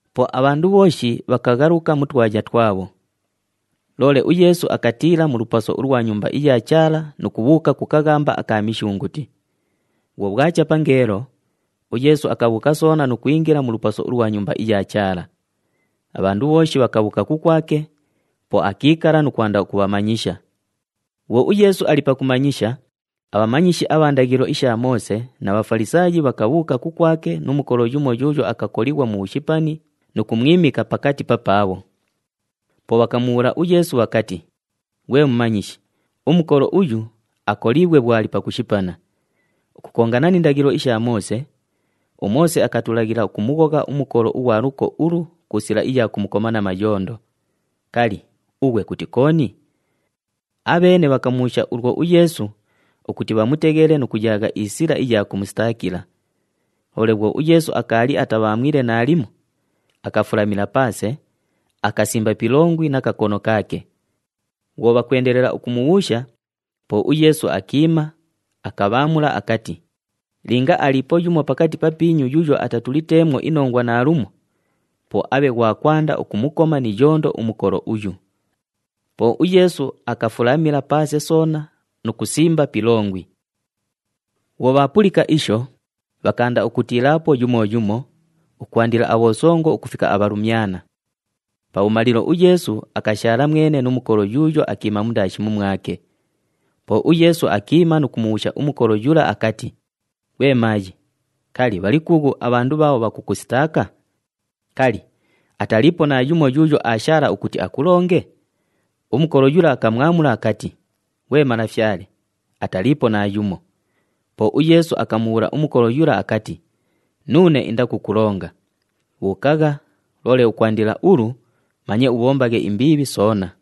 Po abhandu bhooshi bhakaghaluka mu twaya twabho. Loole uYeesu akatiila mu lupaso ulwa Nyumba iya Chaala nu kubhuuka ku kaghamba aka Mishunguti. Bhwo bhwacha pangeelo, uYeesu akabhuuka soona nu kwingila mu lupaso ulwa Nyumba iya Chaala. Abhandu bhooshi bhakabhuuka kukwake, po akiikala nu kwanda ukubhamanyisha. Bhwo uYeesu ali pakumanyisha, abhamanyishi abha ndaghilo isha Moose na Bhafalisaayi bhakabhuuka kukwake nu mukolo yumo yuuyo akakolighwa mu bhushipani nu kumwimika pakati papaabho. Po bhakamubhuula uYeesu bhakati, “Ghwe Mumanyishi, umukolo uyu akoliighwe bhwo ali pakushipana. Ukukongana ni ndaghilo isha Moose, uMoose akatulaghila ukumughogha umukolo ughwa luko ulu ku sila iya kumukoma na mayondo. Kali, ughwe kuti kooni?” Abheene bhakamubhuusha ulwo uYeesu ukuti bhamuteghele nu kuyaagha isila iya kumusitaakila. Loole bhwo uYeesu akaali atabhaamwile naalimo, akafulamila paase, akasimba pi ilongwi na kakono kaake. Bhwo bhakwendelela ukumubhuusha, po uYeesu akiima, akabhaamula akati, “Linga aliipo yumo pakati papiinyu yuuyo atatuliteemwo inongwa naalumo, po abhe ghwa kwanda ukumukoma ni iyondo umukolo uyu.” Po uYeesu akafulamila paase soona nu kusimba pi ilongwi. Bhwo bhaapulika isho, bhakaanda ukutiilaapo yumo yumo, ukwandila abhosongo ukufika abhalumyana. Pabhumalilo uYeesu akashaala mwene nu mukolo yuuyo akiima mundaashi mumwake. Po uYeesu akiima nu kumubhuusha umukolo yula akati, “Ghwe maayi, kali, bhali kuughu abhandu bhaabho bhakukusitaaka? Kali, ataliipo naayumo yuuyo aashaala ukuti akulonge?” Umukolo yula akamwamula akati, “Ghwe Malafyale, ataliipo naayumo.” Po uYeesu akamubhuula umukolo yula akati, “Nuune indakukulonga. Bhuukagha, loole ukwandila ulu, manye ubhombaghe imbiibhi soona.”]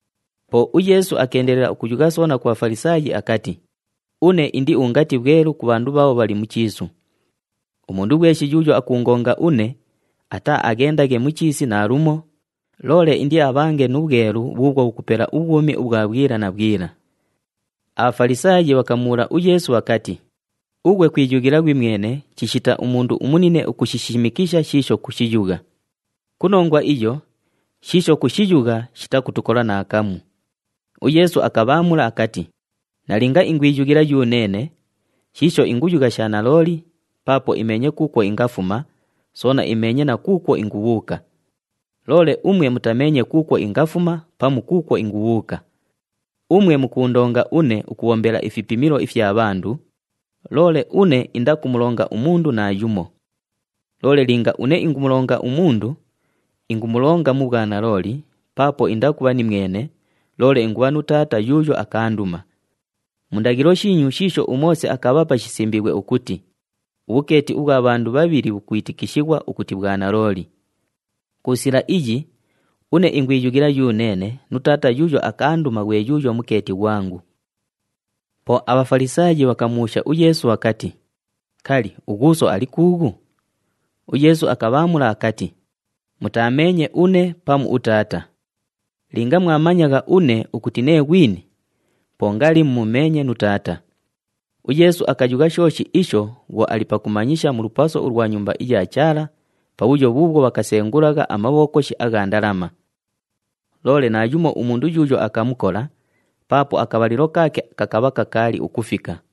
Po uYeesu akeendelela ukuyugha soona ku Bhafalisaayi akati, “Une indi ungati bhwelu ku bhandu bhaabho bhali mu chiisu. Umundu ghweshi yuuyo akuungonga une, ataaaghendaghe mu chiisi naalumo, loole indiabhange nu bhwelu bhuubhwo bhukupela ubhwumi ubhwa bhwila na bhwila.” ABhafalisaayi bhakamubhuula uYeesu bhakati, “Ughwe kwiyughila ghwimwene chishita umundu umunine ukushishimikisha shiisho kushiyugha. Ku nongwa iyo, shiisho kushiyugha shitakutukola naakamu.” UYeesu akabhaamula akati, “Nalinga ingwiyughila yuneene, shiisho inguyugha sha nalooli paapo imeenye kuukwo ingafuma, soona imeenye na kuukwo ingubhuuka. Loole umwe mutameenye kuukwo ingafuma pamu kuukwo ingubhuuka. Umwe mukuundonga une ukubhombela ifipimilo ifya bhandu, loole une indakumulonga umundu naayumo. Loole linga une ingumulonga umundu, ingumulonga mu bhwanalooli paapo indakubha nimwene, loole ingubha nu Taata yuuyo akaanduma. Mu ndaghilo shiinyu shiisho uMoose akabhapa shisimbiighwe ukuti, ‘Ubhukeeti ubhwa bhandu bhabhili bhukwitikishighwa ukuti bhwanalooli.’ Ku sila iyi, une ingwiyughila yuneene nu Taata yuuyo akaanduma ghwe yuuyo mukeeti ghwangu.” Po aBhafalisaayi bhakamubhuusha uYeesu bhakati, “Kali, ughuuso ali kuughu?” UYeesu akabhaamula akati, “Mutaameenye une pamu uTaata. Linga mwamanyagha une ukuti nee ghwini, po ngali mumumeenye nu Taata.” UYeesu akayugha shooshi isho bhwo ali pakumanyisha mu lupaso ulwa Nyumba iya Chaala pabhuyo bhuubhwo bhakasengulagha amabhokoshi agha ndalama. Loole naayumo umundu yuuyo akamukola paapo akabhalilo kaake kakabha kakaali ukufika.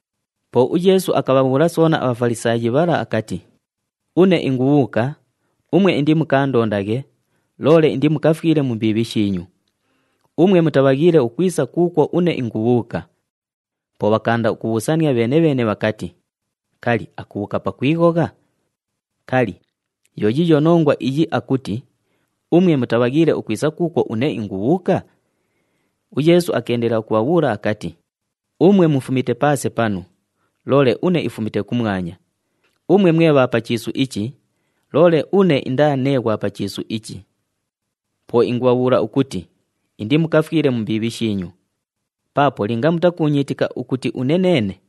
Po uYeesu akabhabhuula soona aBhafalisaayi bhala akati, “Une ingubhuuka, umwe indimukaandondaghe, loole indimukafwile mu mbiibhi shiinyu. Umwe mutabhaghiile ukwisa kuukwo une ingubhuuka.” Po bhakaanda ukubhuusania bheene-bheene bhakati, “Kali, akubhuuka pakwighogha? Kali, yo yiiyo nongwa iyi akuti, ‘Umwe mutabhaghiile ukwisa kuukwo une ingubhuuka’?” UYeesu akeendelela ukubhabhuula akati, “Umwe mufumite paase panu, loole une ifumite kumwanya. Umwe mwe bha pa chiisu ichi, loole une indaa nee ghwa pa chiisu ichi. Po ingubhabhuula ukuti indimukafwile mu mbiibhi shiinyu. Paapo linga mutakuunyiitika ukuti une neene,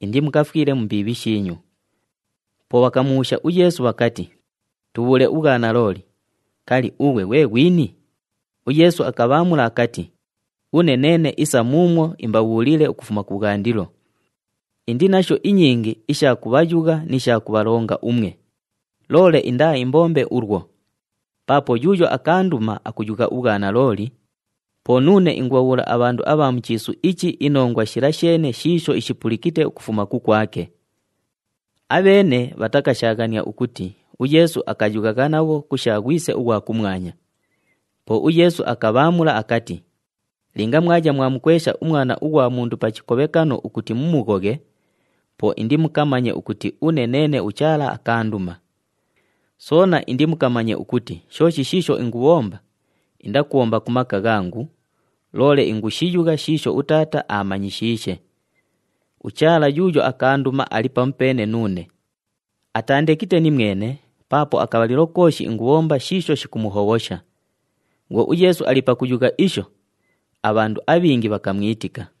indimukafwile mu mbiibhi shiinyu.” Po bhakamubhuusha uYeesu bhakati, “Tubhuule ubhwanalooli, kali, ughwe ghwe ghwini?” UYeesu akabhaamula akati, “Une neene isa muumwo imbabhuuliile ukufuma kubhwandilo. Indi nasho inyingi isha kubhayugha ni sha kubhalonga umwe, loole indaaimbombe ulwo. Paapo yuuyo akaanduma akuyugha ubhwanalooli, po nuune ingubhabhuula abhandu abha mu chiisu ichi inongwa shila sheene shiisho ishipulikite ukufuma kukwake.” Abheene bhatakashaaghania ukuti uYeesu akayughagha nabho ku sha Ghwise ughwa kumwanya. Po uYeesu akabhaamula akati, “Linga mwaya mwamukwesha uMwana ughwa Mundu pa chikobhekano ukuti mumughoghe, po indimukamanye ukuti une neene uChaala akaanduma. Soona indimukamanye ukuti shooshi shiisho ingubhomba, indakubhomba ku maka ghangu, loole ingushiyugha shiisho uTaata aamanyishiishe. UChaala yuuyo akaanduma ali pamupeene nuune, ataandekite nimwene paapo akabhalilo kooshi ingushibhomba shiisho shikumuhobhosha.” Bhwo uYeesu ali pakuyugha isho, abhandu abhingi bhakamwitika.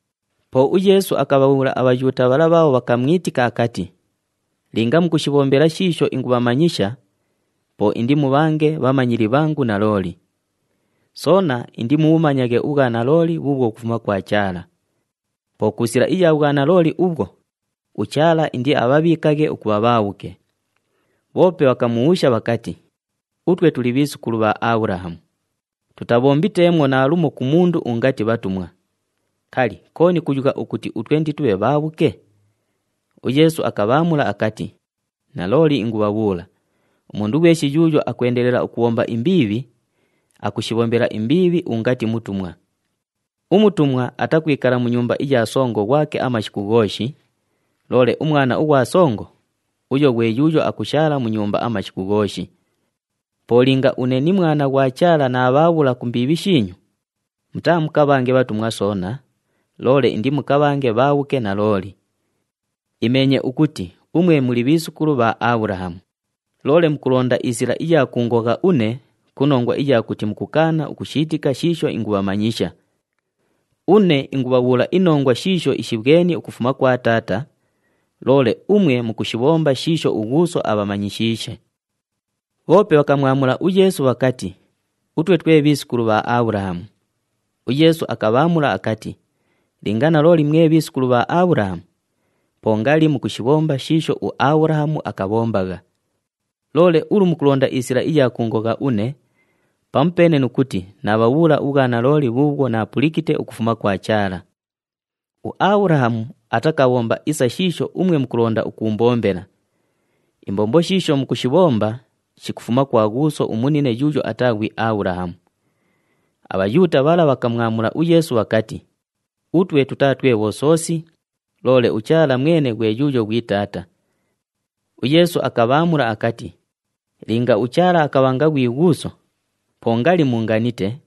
Po uYeesu akabhabhuula aBhayuuta bhala bhaabho bhakamwitika akati, “Linga mukushibhombela shiisho ingubhamanyisha, po indimubhange bhamanyili bhangu nalooli. Soona indimubhumanyaghe ubhwanalooli bhuubhwo bhukufuma kwa Chaala. Po ku sila iya bhwanalooli ubhwo, uChaala indiabhabhiikaghe ukubha bhaabhuke.” Bhoope bhakamubhuusha bhakati, “Utwe tuli bhiisukulu bha Abhulahamu. Tutabhombiteemwo naalumo ku mundu ungati bhatumwa. Kali, kooni kuyugha ukuti utwe inditubhe bhaabhuke?” UYeesu akabhaamula akati, “Nalooli ingubhabhuula, umundu ghweshi yuuyo akwendelela ukubhomba imbiibhi, akushibhombela imbiibhi ungati mutumwa. Umutumwa atakwikala mu nyumba iya songo ghwake amashiku ghooshi, loole umwana ughwa songo, uyo ghwe yuuyo akushaala mu nyumba amashiku ghooshi. Po linga une ni Mwana ughwa Chaala naabhaabhula ku mbiibhi shiinyu, mutaamukabhange bhatumwa soona, loole indimukabhange bhaabhuke nalooli. Imeenye ukuti umwe muli bhiisukulu bha Abhulahamu, loole mukulonda isila iya kuungogha une ku nongwa iya kuti mukukaana ukushiitika shiisho ingubhamanyisha. Une ingubhabhuula inongwa shiisho ishibhweni ukufuma kwa Taata, loole umwe mukushibhomba shiisho ughuuso abhamanyishiishe.” Bhoope bhakamwamula uYeesu bhakati, “Utwe twe bhiisukulu bha Abhulahamu.” UYeesu akabhaamula akati, “Linga nalooli mwe bhiisukulu bha Abhulahamu, po ngali mukushibhomba shiisho uAbhulahamu akabhombagha. Loole ulu mukulonda isila iya kuungogha une pamupeene nu kuti naabhabhuula ubhwanalooli bhuubhwo naapulikite ukufuma kwa Chaala. UAbhulahamu atakabhomba isa shiisho umwe mukulonda ukuumbombela. Imbombo shiisho mukushibhomba shikufuma kwa ghuuso umunine yuuyo ataa ghwi Abhulahamu.” ABhayuuta bhala bhakamwamula uYeesu bhakati, “Utwe tutaa twe bhosoosi, loole uChaala mwene ghwe yuuyo ghwi Taata.” UYeesu akabhaamula akati, “Linga uChaala akabhanga ghwi Ghuuso, po ngali muunganite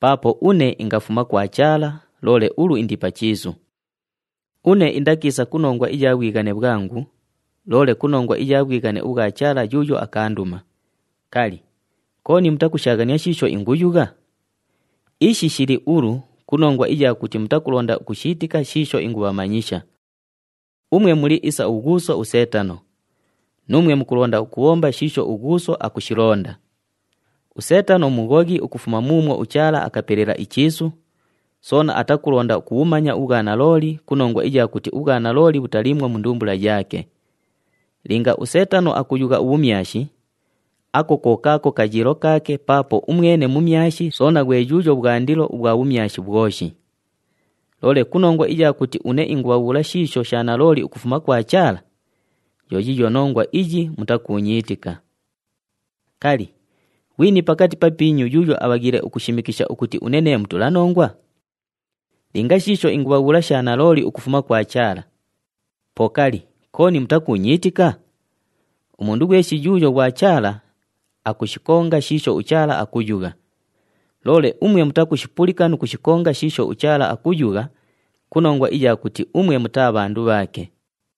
paapo une ingafuma kwa Chaala loole ulu indi pa chiisu. Une indakiisa ku nongwa iya bhwighane bhwangu, loole ku nongwa iya bhwighane ubhwa Chaala yuuyo akaanduma. Kali, kooni mutakushaaghania shiisho inguyugha? Ishi shili ulu ku nongwa iya kuti mutakulonda ukushiitika shiisho ingubhamanyisha. Umwe muli isa ughuuso uSeetano, nuumwe mukulonda ukubhomba shiisho ughuuso akushilonda. USeetano mughoghi ukufuma muumwo uChaala akapelela ichiisu, soona atakulonda ukubhumanya ubhwanalooli ku nongwa iya kuti ubhwanalooli bhutaliimwo mu ndumbula yaake. Linga uSeetano akuyugha ubhumyashi, ako ko kaako kayiilo kaake paapo umwene mumyashi soona ghwe yuuyo bhwandilo ubhwa bhumyashi bhwoshi. Loole ku nongwa iya kuti une ingubhabhuula shiisho sha nalooli ukufuma kwa Chaala, yo yiiyo nongwa iyi mutakuunyiitika. Kali, ghwini pakati papiinyu yuuyo abhaghiile ukushimikisha ukuti une nee mutulanongwa? Linga shiisho ingubhabhuula sha nalooli ukufuma kwa Chaala, po kali, kooni mutakuunyiitika? Umundu ghweshi yuuyo ghwa Chaala, akushikonga shiisho uChaala akuyugha. Loole umwe mutakushipulika nu kushikonga shiisho uChaala akuyugha ku nongwa iya kuti umwe mutaa bhandu bhaake.”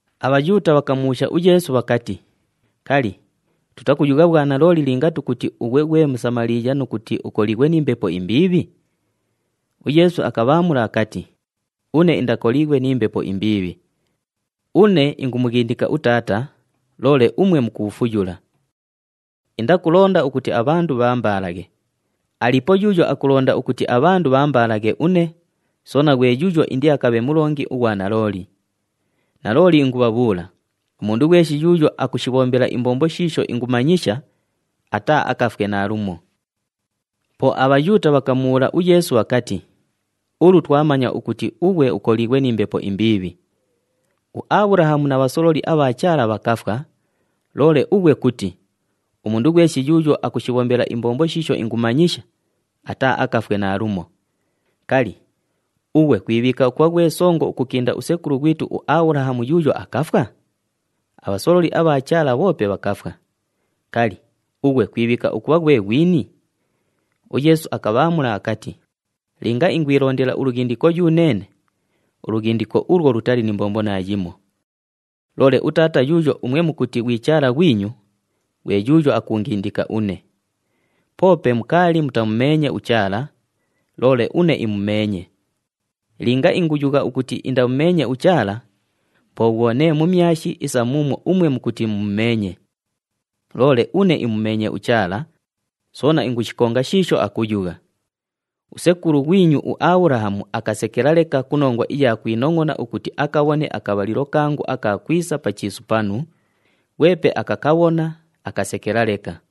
ABhayuuta bhakamubhuusha uYeesu bhakati, “Kali, tutakuyugha bhwanalooli linga tukuti ughwe ghwe Musamaliiya nu kuti ukoliighwe ni mbepo imbiibhi?” UYeesu akabhaamula akati, “Une indakoliighwe ni mbepo imbiibhi. Une ingumughindika uTaata, loole umwe mukuufuyula. Indakulonda ukuti abhandu bhaambaalaghe. Aliipo yuuyo akulonda ukuti abhandu bhaambaalaghe une, soona ghwe yuuyo indiakabhe mulongi ughwa nalooli. Nalooli ingubhabhuula, umundu ghweshi yuuyo akushibhombela imbombo shiisho ingumanyisha, ataaakafwe naalumo.” Po aBhayuuta bhakamubhuula uYeesu bhakati, “Ulu twamanya ukuti ughwe ukoliighwe ni mbepo imbiibhi! UAbhulahamu na bhasololi abha Chaala bhakafwa, loole ughwe kuti, ‘Umundu ghweshi yuuyo akushibhombela imbombo shiisho ingumanyisha, ataaakafwe naalumo.’ Kali, ughwe kwibhiika ukubha ghwe songo ukukinda usekulu ghwitu uAbhulahamu yuuyo akafwa? Abhasololi abha Chaala bhoope bhakafwa. Kali, ughwe kwibhiika ukubha ghwe ghwini?” UYeesu akabhaamula akati, “Linga ingwilondela ulughindiko yuneene, ulughindiko ulwo lutali ni mbombo naayimo. Loole uTaata yuuyo umwe mukuti ghwi Chaala ghwinyu, ghwe yuuyo akuungindika une. Poope mukaali mutamumeenye uChaala, loole une imumeenye. Linga inguyugha ukuti indamumeenye uChaala, po bhwo nee mumyashi isa muumwo umwe mukuti mumumeenye. Loole une imumeenye uChaala, soona ingushikonga shiisho akuyugha. Usekulu ghwinyu uAbhulahamu akasekela leka ku nongwa iya kwinongʼona ukuti akabhone akabhalilo kangu aka kwisa pa chiisu panu, ghwepe akakabhona, akasekela leka.”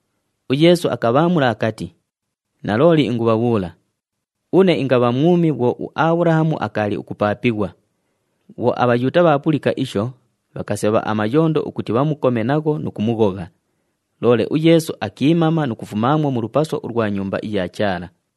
UYeesu akabhaamula akati, “Nalooli ingubhabhuula, une ingabha mwumi bhwo uAbhulahamu akaali ukupaapighwa.” Bhwo aBhayuuta bhaapulika isho, bhakasebha amayondo ukuti bhamukome nagho nu kumughogha, loole uYeesu akiimama nu kufumaamwo mu lupaso ulwa Nyumba iya Chaala.